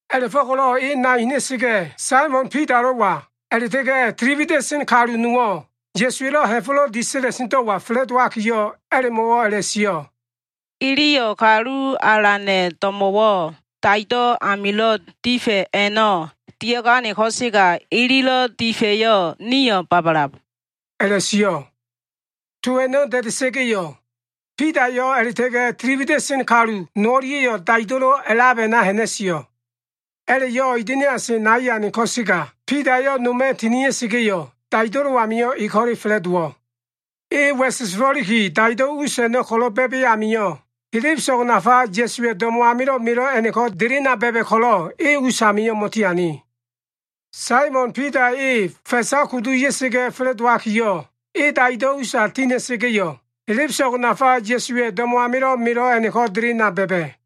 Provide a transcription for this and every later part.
A꞉la꞉fo꞉ko꞉lo꞉ e nai ha꞉na꞉sa꞉ga꞉, Saimon Bidalo꞉wa, a꞉la꞉ta꞉ga꞉ tili wida꞉sen kalu nowo꞉ Ya꞉suwa꞉lo꞉ ha꞉fo꞉lo꞉ disa꞉la꞉sendo꞉wa fa꞉la꞉dowakiyo꞉, a꞉la꞉mo꞉wo꞉ a꞉la꞉sio꞉. “Iliyo꞉ kalu alana꞉ do꞉mo꞉wo꞉ daido꞉ amilo꞉ difa꞉ a꞉no꞉ dia꞉gane ko꞉sega, ililo꞉ difa꞉yo꞉ nio꞉ babalab” a꞉la꞉sio꞉. To a꞉no꞉ da꞉da꞉sa꞉ga꞉yo꞉, Bidayo꞉ a꞉la꞉ta꞉ga꞉ tili wida꞉sen kalu no o꞉lia꞉yo꞉ daido꞉lo꞉ a꞉lab a꞉na ha꞉na꞉sio꞉. A꞉la꞉yo꞉ ida꞉niase nai ane ko꞉sega, Bidayo꞉ noma꞉ tinia꞉sa꞉ga꞉yo꞉, daido꞉lo꞉ amio꞉ e ko꞉le fa꞉la꞉dowo꞉. E wa꞉sesefo꞉liki daido꞉ us a꞉no꞉ ko꞉lo꞉ ba꞉ba꞉ amio꞉, helebeso꞉g nafa Ya꞉suwa꞉ do꞉mo꞉ amilo꞉ melo꞉ a꞉no꞉ko꞉ delena ba꞉ba꞉ ko꞉lo꞉, e us amio꞉ mo꞉tiane. Saimon Bidayo꞉ e fa꞉sa kudu ya꞉ga꞉ fa꞉la꞉dowakiyo꞉, e daido꞉ usa ti ha꞉na꞉sa꞉ga꞉yo꞉ helebeso꞉g nafa Ya꞉suwa꞉ do꞉mo꞉ amilo꞉ melo꞉ a꞉no꞉ko꞉ delena ba꞉ba꞉.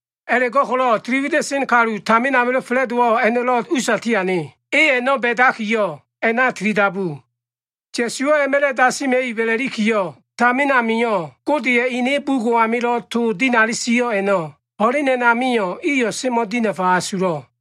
A꞉la꞉go꞉ko꞉lo꞉ tili wida꞉sen kalu tamin amilo꞉ fa꞉la꞉dowo꞉ a꞉no꞉lo꞉ usa tiane. E a꞉no꞉ ba꞉dakiyo꞉, a꞉na tili dabu. Ya꞉suwo꞉ a꞉ma꞉la꞉ dasima꞉ib a꞉la꞉likiyo꞉, tamin amio꞉ Godeya꞉ ene bugo꞉ amilo꞉ to dinali sio꞉ a꞉no꞉, ho꞉len a꞉namio꞉ iyo꞉ semo꞉ dinafa asulo꞉.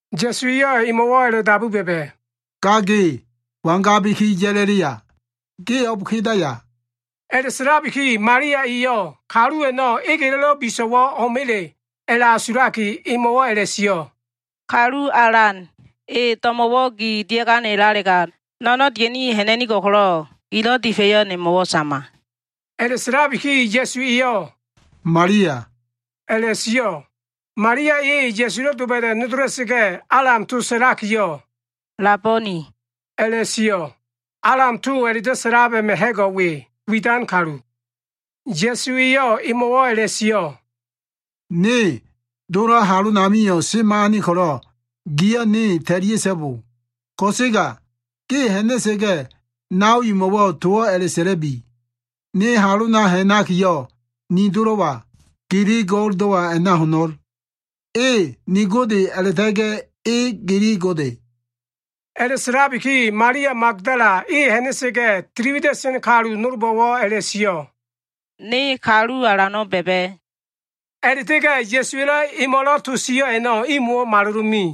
Ya꞉su eyo꞉ emo꞉wo꞉ a꞉la꞉dabu ba꞉ba꞉, “Ga ge, wangabiki ya꞉la꞉la꞉ya? Ge o꞉b kedaya?” A꞉la꞉sa꞉labiki Malia eyo꞉ kalu a꞉no꞉ egelo꞉lo꞉ biso꞉wo꞉ o꞉ma꞉le a꞉la꞉asulaki, emo꞉wo꞉ a꞉la꞉sio꞉, “Kalu Alan, e do꞉mo꞉wo꞉ gi dia꞉ganelalega, no꞉no꞉n dia꞉ni ha꞉na꞉nigo꞉l ko꞉lo꞉, gilo꞉ difa꞉yo꞉ nemo꞉wo꞉ sama.” A꞉la꞉sa꞉labiki Ya꞉su eyo꞉, “Malia” a꞉la꞉sio꞉. Malia e Ya꞉sulo꞉ doba꞉da꞉ nodola꞉sa꞉ga꞉, Alam to sa꞉lakiyo꞉, “Labonai” a꞉la꞉sio꞉. Alam to a꞉la꞉do꞉ sa꞉lab a꞉ma꞉ ha꞉go꞉ we, widan kalu. Ya꞉su eyo꞉ emo꞉wo꞉ a꞉la꞉sio꞉, “Ne Dolo꞉ halonamio꞉ semo꞉ ane ko꞉lo꞉, giyo꞉ ne ta꞉lia꞉so꞉bo! Ko꞉sega ge ha꞉na꞉sa꞉ga꞉, nao imo꞉wo꞉ towo꞉ a꞉la꞉sa꞉la꞉bi, ‘Ne halona ha꞉nakiyo꞉, ni Dolo꞉wa, gili Go꞉ldo꞉wa a꞉na ho꞉no꞉l. E ni Gode a꞉la꞉ta꞉ga꞉, e gili Gode.’” A꞉la꞉sa꞉labiki Malia Magdala e ha꞉na꞉sa꞉ga꞉, tili wida꞉sen kalu nolbo꞉wo꞉ a꞉la꞉sio꞉, “Ne Kalu Alano꞉ ba꞉ba꞉.” A꞉la꞉ta꞉ga꞉ Ya꞉suwa꞉lo꞉ emo꞉lo꞉ to sio꞉ a꞉no꞉ imo꞉wo꞉ malolo꞉ me.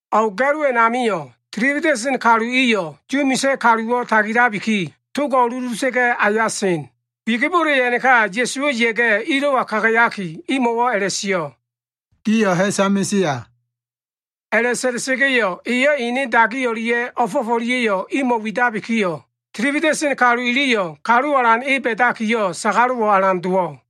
O꞉g ga꞉lo a꞉namio꞉ tili wida꞉sen kalu iyo꞉ Yu misa꞉ kaluwo꞉ tagilabiki, togo꞉ uluda꞉sa꞉ga꞉ aya sen. Wigibole a꞉naka Ya꞉suwo꞉ ya꞉ga꞉, ilo꞉wa kagayaki, imo꞉wo꞉ a꞉la꞉sio꞉, “Gio꞉ ha꞉sa mesea.” A꞉la꞉sa꞉la꞉sa꞉ga꞉yo꞉, eyo꞉ ene dagi o꞉lia꞉ o꞉fo꞉f o꞉lia꞉yo꞉ imo꞉ widabikiyo꞉, tili wida꞉sen kalu iliyo꞉ Kalu Alan e ba꞉dakiyo꞉ sagalo꞉wo꞉ alan dowo꞉.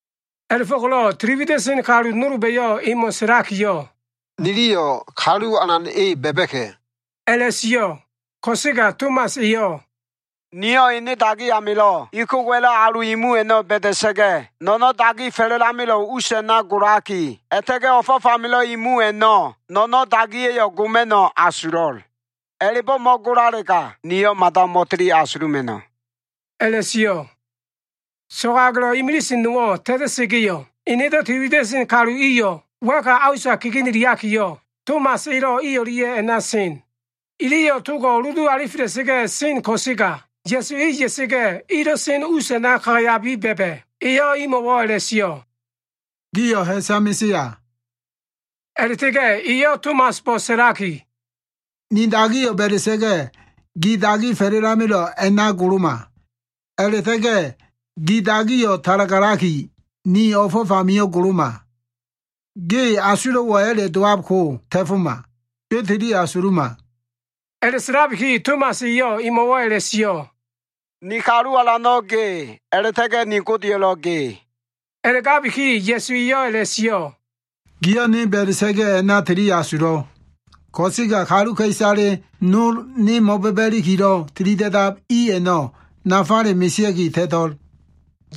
A꞉la꞉fo꞉ko꞉lo꞉ tili wida꞉sen kalu nolba꞉yo꞉ emo꞉ sa꞉lakiyo꞉, “Niliyo꞉ Kalu Alan e ba꞉ba꞉ka꞉” a꞉la꞉sio꞉. Ko꞉sega Tomas eyo꞉, “Niyo꞉ ene dagi amilo꞉ ikogowa꞉lo꞉ alu imu a꞉no꞉ ba꞉da꞉sa꞉ga꞉, no꞉no꞉n dagi fa꞉la꞉lamelo꞉ us a꞉na golaki, a꞉la꞉ta꞉ga꞉ o꞉fo꞉f amilo꞉ imu a꞉no꞉ no꞉no꞉n dagiya꞉yo꞉ goma꞉no꞉ asulo꞉l. A꞉la꞉bo꞉ mo꞉golalega, niyo꞉ mada mo꞉tili asuluma꞉no꞉” a꞉la꞉sio꞉. So꞉go꞉ agelo꞉ imilise nowo꞉ ta꞉ta꞉sa꞉ga꞉yo꞉, enedo꞉ tili wida꞉sen kalu iyo꞉ wa꞉ka a usa kegeneliakiyo꞉, Tomas elo꞉ i o꞉lia꞉ a꞉na sen. Iliyo꞉ togo꞉ uludu alifela꞉sa꞉ga꞉ sen ko꞉sega Ya꞉su e ya꞉sa꞉ga꞉, ilo꞉ sen us a꞉na kagayabiki ba꞉ba꞉. Eyo꞉ imo꞉wo꞉ a꞉la꞉sio꞉, “Gio꞉ ha꞉sa mesea.” A꞉la꞉ta꞉ga꞉ eyo꞉ Tomasbo꞉ sa꞉laki, “Ni dagiyo꞉ ba꞉da꞉sa꞉ga꞉, Gi dagi fa꞉la꞉lamelo꞉ a꞉na goloma. A꞉la꞉ta꞉ga꞉ gi dagiyo꞉ talagalaki, ni o꞉fo꞉f amio꞉ goloma. Ge asulo꞉wo꞉ a꞉la꞉ dowab ko ta꞉foma. Ge tili asuluma!” A꞉la꞉sa꞉labiki Tomas eyo꞉ emo꞉wo꞉ a꞉la꞉sio꞉, “Ni Kalu Alano꞉ ge, a꞉la꞉ta꞉ga꞉ ni Godeyo꞉lo꞉ ge.” A꞉la꞉gabiki Ya꞉su eyo꞉ a꞉la꞉sio꞉, “Giyo꞉ ne ba꞉da꞉sa꞉ga꞉ a꞉na tili asulab. Ko꞉sega kaluka꞉isale nolo꞉ ne mo꞉ba꞉ba꞉ ilikilo꞉ tilida꞉dab i a꞉no꞉ nafale mesea꞉ki ta꞉to꞉l.”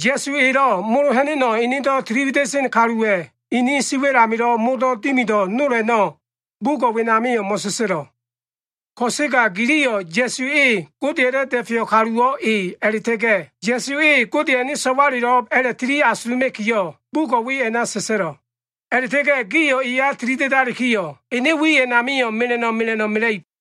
Ya꞉su eyo꞉ molo ha꞉na꞉no꞉ enedo꞉ tili wida꞉sen kaluwa꞉ ini siwa꞉l amilo꞉ modo꞉ dimido꞉ nol a꞉no꞉, bugo꞉ wenamio꞉ mo꞉sa꞉sa꞉lo꞉. Ko꞉sega giliyo꞉ Ya꞉su e Godeya꞉lo꞉ da꞉feyo꞉ kaluwo꞉ e a꞉la꞉ta꞉ga꞉ Ya꞉su e Godeya꞉ ene So꞉walelo꞉b a꞉la꞉tili asuluma꞉kiyo꞉, bugo꞉ we a꞉na sa꞉sa꞉lo꞉. A꞉la꞉ta꞉ga꞉ gio꞉ eya tili da꞉dalikiyo꞉, ene wi a꞉namio꞉ mela꞉no꞉ mela꞉no꞉ mela꞉ib.